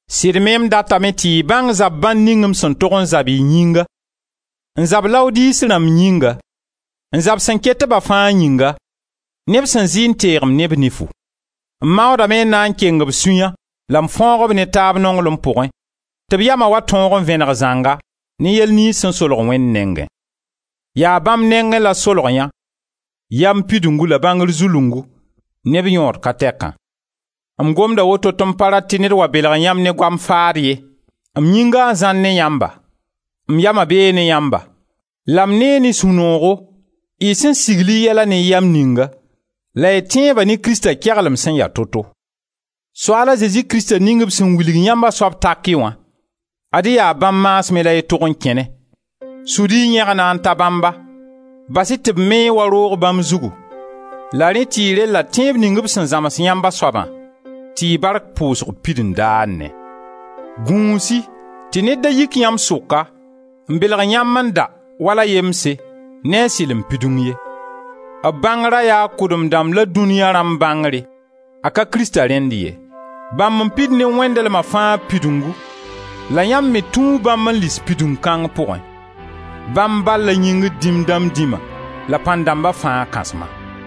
Sɩd me m datame tɩ y bãng zab-bãnd ning m sẽn tog n zab y yĩnga, n zab Laodise rãmb yĩnga, n zab sẽn ket-ba fãa yĩnga, neb sẽn zɩ n teeg-m ne b nifu. M maoodame n na n keng b sũya la m fãoog-b ne taab nonglem pʋgẽ tɩ b yama wa tõog n vẽneg zãnga ne yɛl niyns sẽn solg Wẽnd nengẽ. Yaa bãmb nengẽ la solg yã yam pidungu la bãngr zulungu ne b yõod ka tɛkã. M gomda woto tɩ m pa rat tɩ ned wa belg yãmb ne goam faad ye. M yĩnga n zãar ne yãmba, m yama bee ne yãmba la m nee ne sũ-noogo y sẽn sigl y yɛla ne yam ninga la y tẽebã ne Krista keglem sẽn ya to-to. Soaal a Zezi Krista ning b sẽn wilg yãmb a soab taki wã, ad-y yaa bãmb maasmẽ la y tog n kẽne. Sud-y y yẽgna n ta bãmba, bas-y tɩ b me-y wa roog bãmb zugu, la rẽ tɩ y rella tẽeb ning b sẽn zãms yãmb a soabã, tɩ y bark pʋʋsg pid n daanẽ. Gũus-y tɩ ned da yik yãmb sʋka n belg yãmb n da, wala yemse, ne a sɩlem pidung ye; b bãngra yaa kʋdem-dãmb la dũnia rãmb bãngre, a ka Krista rẽnd ye. Bãmb n pid ne wẽndlema fãa pidungu la yãmb me tũu bãmb n lis pidung kãng pʋgẽ. Bãmb bal la yĩngr dĩm dãmb dĩma la pãn-dãmba fãa Kãsma: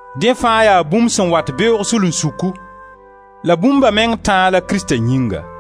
Dẽ fãa yaa bũmb sẽn wat beoog sulunsuku, la bũmba meng tãa la Krista Yĩnga.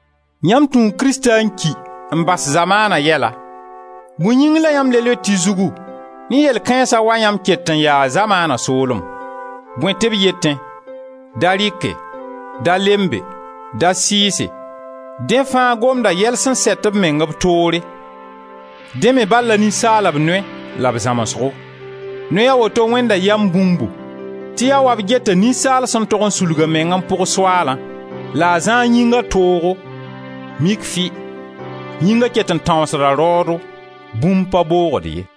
Yãmb tũu Krista n ki n bas zamaana yɛla, bõe yĩng la yãmb le loet y zugu ne yell kãensã wa yãmb ket n yaa zamaana soolem? Bõe tɩ b yetẽ: «Da rɩke, da lembe, da sɩɩse», dẽ fãa gomda yɛl sẽn sɛt b meng b toore, dẽ me bal la ninsaalb noy la b zãmsgo. Noy a woto wẽnda yam bũmbu tɩ yaa wa b geta ninsaal sẽn tog n sulg a meng n pʋg Soaalã, la a zã a yĩnga toogo, mik fɩ! Yĩnga ket n tãoosda raoodo, bũmb pa boogd ye.